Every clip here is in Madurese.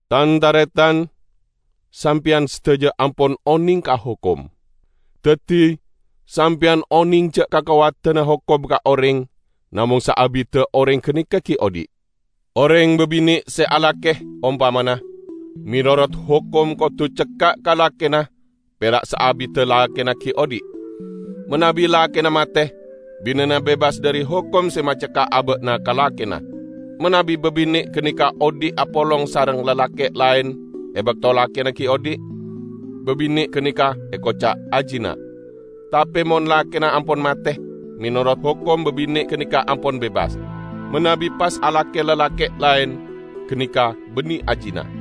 Tan-taretan! Sampeyan sadaja ampon oneng ka hokom. Daddi, sampeyan oneng ja' kakowadanna hokom ka oreng namong saabidda oreng ganeka gi' odhi'. Oreng babine' se alake, ompamana, menorot hokom kodu cekka' ka lakena pera' saabidda lakena gi' odhi'. Manabi lakena mate, binena bebas dhari hokom se macekka' aba'na ka lakena. Manabi babine' ganeka odhi' apolong sareng lalake' laen e bakto lakena gi' odhi', babine' ganeka ekoca' azina. Tape mon lakena ampon mate, menorot hokom babine' ganeka ampon bebas. Manabi pas alake lalake' laen, ganeka banne azina.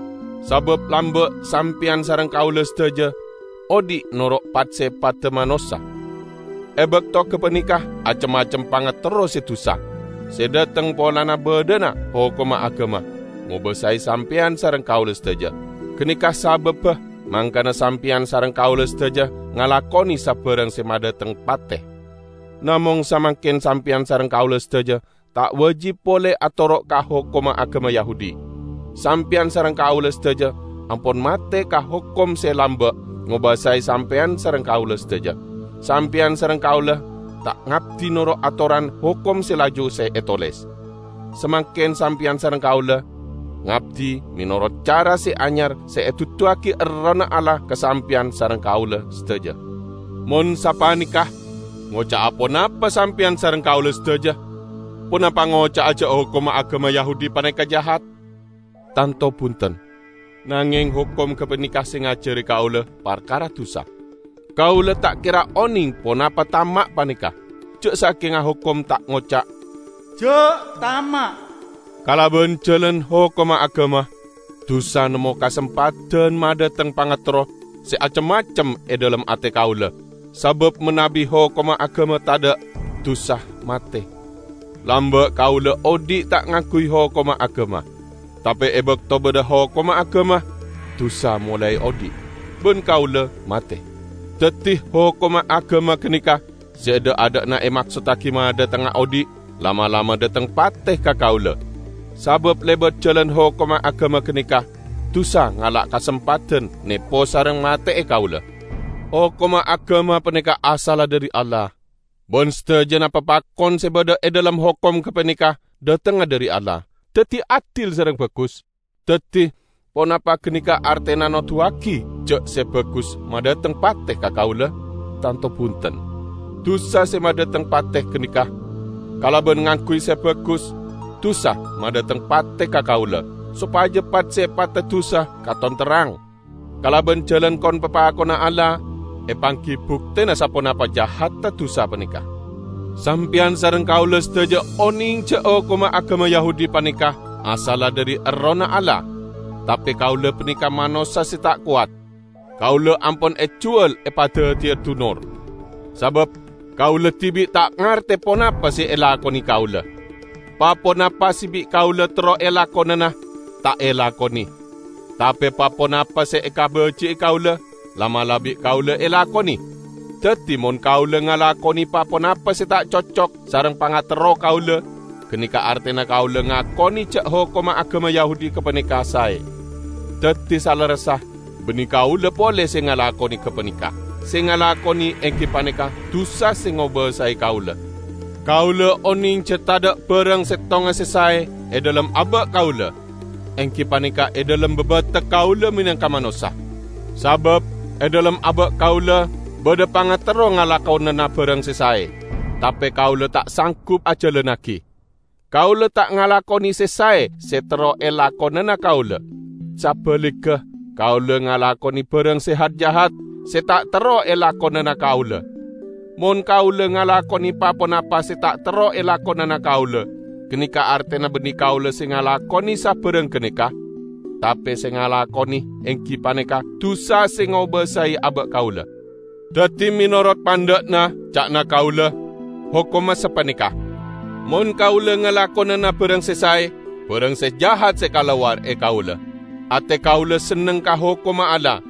Sabab lamba' sampeyan sareng kaula sadaja odhi' noro' pat-sepadda manossa. E bakto gapaneka acem-macem pangaterro se dusa, se dhateng polana badhana hokomma agama, ngobasae sampeyan sareng kaula sadaja. Ganeka sababba mangkana sampeyan sareng kaula sadaja ngalakone sabarang se madhateng pate. Namong samangken sampeyan sareng kaula sadaja ta' wajib pole atoro' ka hokomma agama Yahudi. Sampeyan sareng kaula sadaja ampon mate ka hokom se lamba' ngobasae sampeyan sareng kaula sadaja. Sampeyan sareng kaula ta' ngabdi noro' atoran hokom se laju se etoles. Samangken sampeyan sareng kaula ngabdi menorot cara se anyar se eduduwagi Errohna Allah ka sampeyan sareng kaula sadaja. Mon sapaneka, ngoca'a ponapa sampeyan sareng kaula sadaja? Ponapa ngoca'a ja' hokomma agama Yahudi paneka jahat? Tanto bunten! Nangeng hokom gapaneka se ngajari kaula parkara dusa. Kaula ta' kera oneng ponapa tama' paneka, ja' sakenga hokom ta' ngoca', "Ja' tama'." Kalaban jalan hokomma agama, dusa nemmo kasempadan madhateng pangaterro se acem-macem e dhalem ate kaula; sabab manabi hokomma agama tadha', dusa mate. Lamba' kaula odhi' ta' ngangguy hokomma agama. Tape e bakto badha hokomma agama, dusa molae odhi', ban kaula mate. Daddi hokomma agama ganeka, se dha'-adha'na emaksottagi madhatengnga odhi', la'-mala' madhateng pate ka kaula. Sabab lebat jalan hokomma agama ganeka, dusa ngala' kasempadan nepo sareng mate'e kaula. Hokomma agama paneka asalla dhari Allah, ban sadajana papakon se badha e dhalem hokom gapaneka dhatengnga dhari Allah, daddi adil sareng bagus. Daddi, ponapa ganeka artena noduwagi ja' se bagus madhateng pate ka kaula? Tanto bunten! Dusa se madhateng pate ganeka. Kalaban ngangguy se bagus, dusa madhateng pate ka kaula, sopaja pat-sepadda dusa katon terrang. Kalaban jalan kon-papakonna Allah, epanggi buktena saponapa jahadda dusa paneka. Sampeyan sareng kaula sadaja oneng ja' hokomma agama Yahudi paneka asalla dhari Errohna Allah; tape kaula paneka manossa se ta' kowat. Kaula ampon ejuwal epadaddiya dunor. Sabab kaula dibi' ta' ngarte ponapa se elakone kaula. Pa-ponapa se bi' kaula terro elakonana, ta' elakone; tape pa-ponapa se ekabaji'i kaula, la'-mala' bi' kaula elakone. Daddi, mon kaula ngalakone pa-ponapa se ta' cocok sareng pangaterro kaula, ganeka artena kaula ngakone ja' hokomma agama Yahudi gapaneka sae. Daddi, salerressa banne kaula pole se ngalakone gapaneka; se ngalakone enggi paneka dusa se ngobasae kaula. Kaula oneng ja' tadha' barang settonga se sae e dhalem aba' kaula; enggi paneka e dhalem babatek kaula menangka manossa. Sabab e dhalem aba' kaula badha pangaterro ngalakonana barang se sae, tape kaula ta' sanggup ajalannagi. Kaula ta' ngalakone se sae se terro elakonana kaula. Sabaligga, kaula ngalakone barang se hat-jahat, se ta' terro elakonana kaula. Mon kaula ngalakone pa-ponapa se ta' terro elakonana kaula, ganeka artena banne kaula se ngalakone sabarang ganeka, tape se ngalakone enggi paneka dusa se ngobasae aba' kaula. Daddi menorot pandha'na, ca'na kaula, hokomma sapaneka: mon kaula ngalakonana barang se sae, barang se jahat se kalowar e kaula. Ate kaula senneng ka hokomma Allah,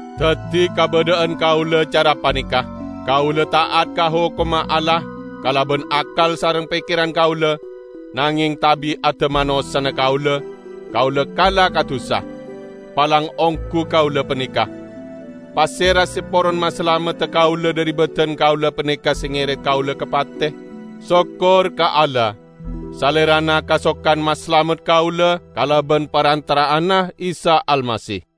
Daddi kabadha'an kaula cara paneka: kaula ta'at ka hokomma Allah kalaban akkal sareng pekkeran kaula, nangeng tabi'adda manossana kaula, kaula kala ka dusa. Palang onggu kaula paneka! Pasera se poron masalamedda kaula dhari badan kaula paneka se ngeret kaula ka pate? Sokkor ka Allah! Salerana kasokan masalamet kaula kalaban parantara'anna Isa Almasih.